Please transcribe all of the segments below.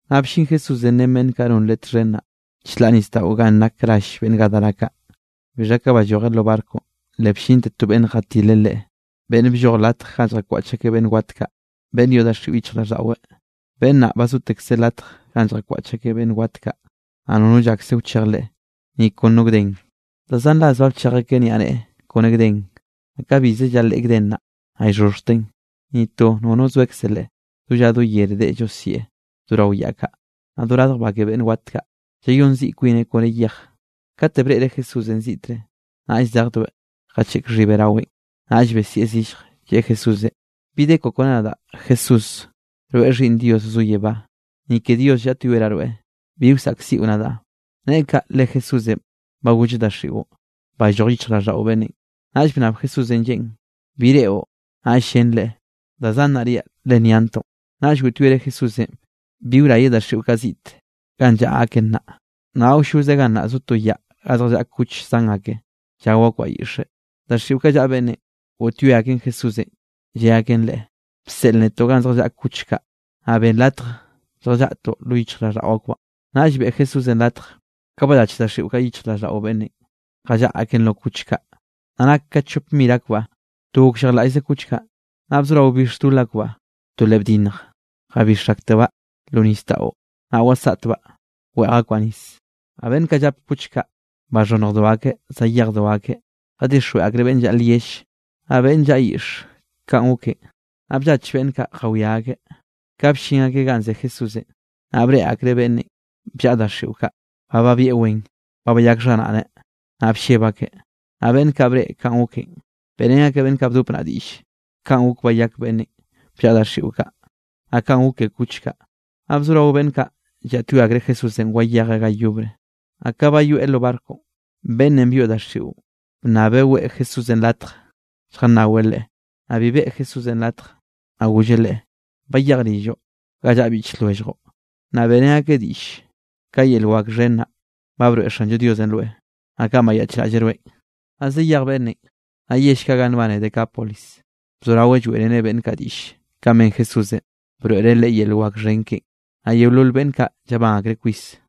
Naꞌ bllin Jesúsenꞌ ren beꞌnn kaꞌ non Leꞌe txhen naꞌ, chlaꞌ nisdaꞌo ganꞌ nak rall beꞌnn Gadara kaꞌ. Bixha ka ballojeꞌ lo barconꞌ, le bllinte to beꞌnn jatileꞌ Leꞌe, beꞌnn blloj latj ganꞌ lljakwaꞌch akeꞌ beꞌnn wat kaꞌ, beꞌnn yoꞌ daxiꞌo yichjraꞌlldaꞌweꞌ. Beꞌnn naꞌ ba zotekzeꞌ latj ganꞌ lljakwaꞌch akeꞌ beꞌnn wat kaꞌ, naꞌ nono llakse wchej leꞌe, ni kon no gden. Da zan ras ba bchej akeꞌ niaꞌneꞌe kone gden, naꞌ ka bize llaleꞌe gden naꞌ, naꞌ llxhoxhjteꞌn, ni to nono zoekze leꞌe. Do lla do yere deꞌe llosieꞌ do rao yaꞌ kaꞌ, naꞌ do radj ba ke beꞌnn wat kaꞌ, llayón ziꞌ kwineꞌ kone yej. Kate breꞌreꞌ Jesúsenꞌ ziꞌtre, naꞌll zejdoeꞌ jacheꞌk xhibeꞌ raweꞌn. Naꞌll besieꞌ zillj, lleꞌe Jesúsenꞌ: —¿Bi de koꞌo kone nadaꞌ, Jesús? Rweꞌ Xhiꞌnn Dios zo yebá. ¡Ni ke Dios llaꞌtyoeraꞌ rweꞌ, bi wsaꞌkziꞌo nadaꞌ! Neꞌe kaꞌ, le Jesúsenꞌ ba golleꞌ daxiꞌon: —¡Balloj yichjraꞌlldaꞌo beꞌnnenꞌ! Naꞌll bnnab Jesúsenꞌ lleꞌen: —¿Bi reꞌo? Naꞌll llen Leꞌe: —Da Zan naꞌ riaꞌ, le nyantoꞌ. Naꞌll goꞌtyoereꞌ Jesúsenꞌ bi wrayeꞌ daxiꞌo kaꞌ ziꞌt ganꞌ llaꞌa aken naꞌ. Naꞌ awlloze gannaꞌ zo to yaꞌ ga zjallaꞌa kuch zan ake, llao akbaꞌ yiꞌxe. Daxiꞌo kaꞌ llaꞌa beꞌnnenꞌ, goꞌtyoe aken Jesúsenꞌ lle aken Leꞌe: —Bseꞌl netoꞌ ganꞌ zjallaꞌa kuch kaꞌ, naꞌ benn latje lljallaꞌtoꞌ lo yichjraꞌlldaꞌo akbaꞌn. Naꞌll beꞌe Jesúsenꞌ latj. Ka ballach daxiꞌo kaꞌ yichjraꞌlldaꞌo beꞌnnenꞌ, jallaꞌa aken lo kuch kaꞌ. Naꞌ nake ka chop mir akbaꞌ. To gokllejlaꞌllze kuch kaꞌ, naꞌ bzorao bix dol akbaꞌ to le bdinnj, jabix aktebaꞌ lo nisdaꞌon, naꞌ wasaꞌtbaꞌ, weꞌj akbaꞌ nis. Naꞌ beꞌnn kaꞌ llap kuch kaꞌ, baxhonnjdo akeꞌ zayejdo akeꞌ, jadixjweꞌ akreꞌ beꞌnn llaꞌa lyell, naꞌ beꞌnn llaꞌa lyiꞌxe kanꞌ goken. Naꞌ bllach beꞌnn kaꞌ jawiá akeꞌ. Ka bllin akeꞌ ganꞌ ze Jesúsenꞌ, naꞌ breꞌe akreꞌ beꞌnnenꞌ bllaꞌa daxiꞌo kaꞌ, ba babieꞌ wen, ba bayak xharaꞌneꞌ. Naꞌ blleb akeꞌ. Naꞌ beꞌnn kaꞌ breꞌe kanꞌ goken, beꞌrén akeꞌ beꞌnn kaꞌ bdop naꞌ diꞌlle, kanꞌ gok bayak beꞌnnenꞌ bllaꞌa daxiꞌo kaꞌ, naꞌ kanꞌ gok ke kuch kaꞌ. Naꞌ bzorao beꞌnn kaꞌ llaꞌtyoe akreꞌ Jesúsenꞌ wayejeꞌ ga yobre. Naꞌ ka bayoeꞌ lo barconꞌ, beꞌnnenꞌ byoꞌ daxiꞌon bnnabeꞌ weꞌe Jesúsenꞌ latjeꞌ lljannaweꞌ Leꞌe. Naꞌ bi beꞌe Jesúsenꞌ latjeꞌ, naꞌ golleꞌ leꞌe: —Bayej rilloꞌ ga llaꞌa biꞌch lwelljoꞌ, naꞌ beꞌrén akeꞌ diꞌll ka yel wak xhen naꞌ, ba broeꞌ Xanllo Diosenꞌ rweꞌ, naꞌ kanꞌ bayaꞌchraꞌlleꞌ rweꞌn. Naꞌ zayej beꞌnnenꞌ, naꞌ yell kaꞌ ganꞌ nbane Decápolis bzoraweꞌ lloeꞌreneꞌ beꞌnn kaꞌ diꞌll kanꞌ ben Jesúsenꞌ broeꞌreꞌ leꞌe yel wak xhen keꞌen; naꞌ yeolol beꞌnn kaꞌ llabán akreꞌ kwis.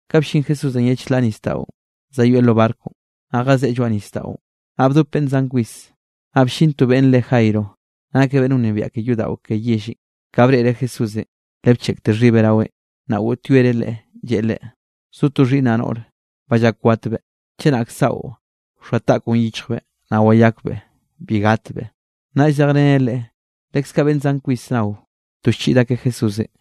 Ka ballín Jesúsenꞌ ye chlaꞌ nisdaꞌon zayoeꞌ lo barconꞌ, naꞌ jazeꞌe lloaꞌ nisdaꞌon, naꞌ bdope beꞌnn zan kwis. Naꞌ bllin to beꞌnn re Jairo, nakeꞌ beꞌnn wnebiaꞌ ke yodaꞌo ke yellenꞌ. Ka breꞌreꞌ Jesúsenꞌ le bcheꞌkte xhibeꞌ raweꞌn. Naꞌ goꞌtyoereꞌ Leꞌe, lleꞌe Leꞌe: —Zo to xhiꞌnnaꞌ noꞌre, ba llak watbeꞌ; chenak saꞌo wxoa taꞌkoꞌn yichjbeꞌ naꞌ wayakbeꞌ, bi gatbeꞌ. Naꞌll zejreneꞌ leꞌe, leskaꞌ beꞌnn zan kwis nao, to llchiꞌd akeꞌ Jesúsenꞌ.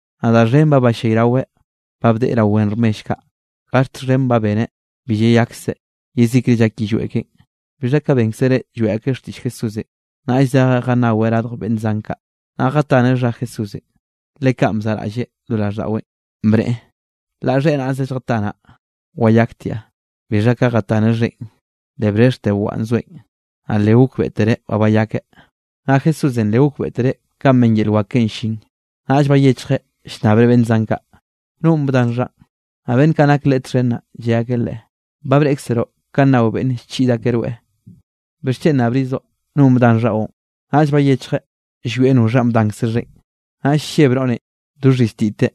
Naꞌ da xhen ba ballayraweꞌ ba bdeꞌe rao wen rmell kaꞌ, gaxt xhen ba beneꞌ bi llayakseꞌ, yezikre llak yillweꞌ keꞌen. Bixha ka bénkzereꞌ lloeꞌ akeꞌ xtiꞌll Jesúsenꞌ, naꞌll zejeꞌ jannaweꞌ radj beꞌnn zan kaꞌ, naꞌ jataneꞌ xha Jesúsenꞌ. Le kanꞌ bzaꞌraꞌlleꞌ lo raꞌlldaꞌweꞌn bneꞌe: “Laꞌ xheꞌe naꞌze lljatanaꞌ wayaktiaꞌ.” Bixha ka jataneꞌ xheꞌen, le brexhte waꞌan llzoeꞌn, naꞌ le gokbeꞌtereꞌ ba bayakeꞌ. Naꞌ Jesúsenꞌ le gokbeꞌtereꞌ ka ben yel wak keꞌen llin, naꞌll bayechjeꞌ llnnabreꞌ beꞌnn zan kaꞌ: —¿Nonꞌ bdan xhaꞌn? Naꞌ beꞌnn kaꞌ nak Leꞌe txhen naꞌ, lle akeꞌ Leꞌe: —Ba breꞌkzeroꞌ kanꞌ nao beꞌnn llchiꞌd akeꞌ rweꞌ. ¿Bixchen nnabrizoꞌ nonꞌ bdan xhaꞌon? Naꞌll bayechjeꞌ llwieꞌ noxhanꞌ bdankze xheꞌen. Naꞌll lleb noꞌrenꞌ do xhiztiteꞌ,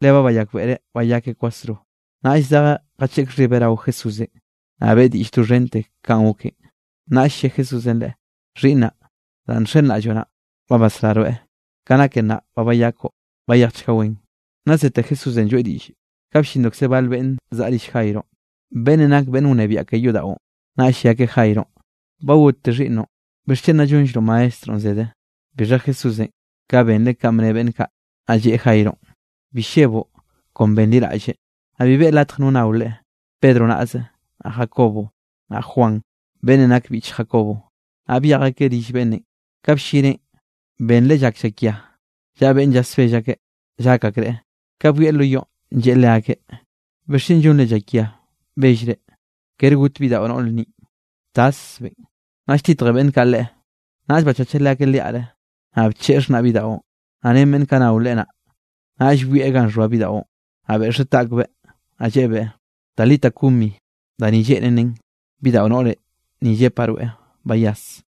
le ba bayakbeꞌreꞌ bayakeꞌ kwasro, naꞌll zejeꞌ jacheꞌk xhibeꞌ rao Jesúsenꞌ, naꞌ beꞌe diꞌll doxhente kanꞌ goken. Naꞌll lle Jesúsenꞌ leꞌe: —Xhiꞌnnaꞌ, danꞌ nxenraꞌlloꞌ naꞌn, ba basrá rweꞌ, ka nake nnaꞌ ba bayakoꞌ, bayejchga wen. Naꞌ zete Jesúsenꞌ lloeꞌ diꞌllenꞌ, ka bllindokze bal beꞌnn zaꞌa rill Jaironꞌ, beꞌnnenꞌ nak beꞌnn wnebiaꞌ ke yodaꞌon, naꞌll lle akeꞌ Jaironꞌ: —Ba gotte xhiꞌnnoꞌn, ¿bixchen nna llonllroꞌ Maestronꞌ zede? Bixha Jesúsenꞌ, ka benreꞌ kanꞌ bne beꞌnn kaꞌ, naꞌ lleꞌe Jaironꞌ: —Bi lleboꞌ, kon benliraꞌlle. Naꞌ bi beꞌe latj no nnao Leꞌe, Pedro naꞌze, naꞌ Jacobo, naꞌ Juan, beꞌnnenꞌ nak biꞌch Jacobo. Naꞌ byej akeꞌ rill beꞌnnenꞌ; ka bllineꞌn, benreꞌ llak llakia, llaꞌa beꞌnn llasbell akeꞌ llak akreꞌ. Ka byoeꞌ lo yoꞌn lleꞌe leakeꞌ: —¿Bixchen llonre llakia bellre? Kere got bidaꞌo noꞌr ninꞌ, taszbeꞌn. Naꞌll lltitje beꞌnn kaꞌ Leꞌe. Naꞌll bachacheꞌ leakeꞌ liaꞌre, naꞌ bcheꞌe xaxhnaꞌ bidaꞌon, naꞌ ren beꞌnn kaꞌ nao Leꞌe naꞌ, naꞌll byoeꞌ ganꞌ xhoa bidaꞌon. Naꞌ beꞌxeꞌ taꞌkbeꞌ, naꞌ lleꞌebeꞌ: —Talita, cumi —da ni lleꞌnen nen: Bidaꞌo noꞌre ni llepaꞌ rweꞌ, bayas.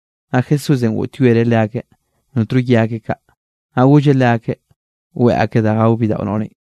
Naꞌ Jesúsenꞌ goꞌtyoereꞌ leakeꞌ notno ye akeꞌ kaꞌ, naꞌ golleꞌ leakeꞌ weꞌe akeꞌ da gao bidaꞌo noꞌrenꞌ.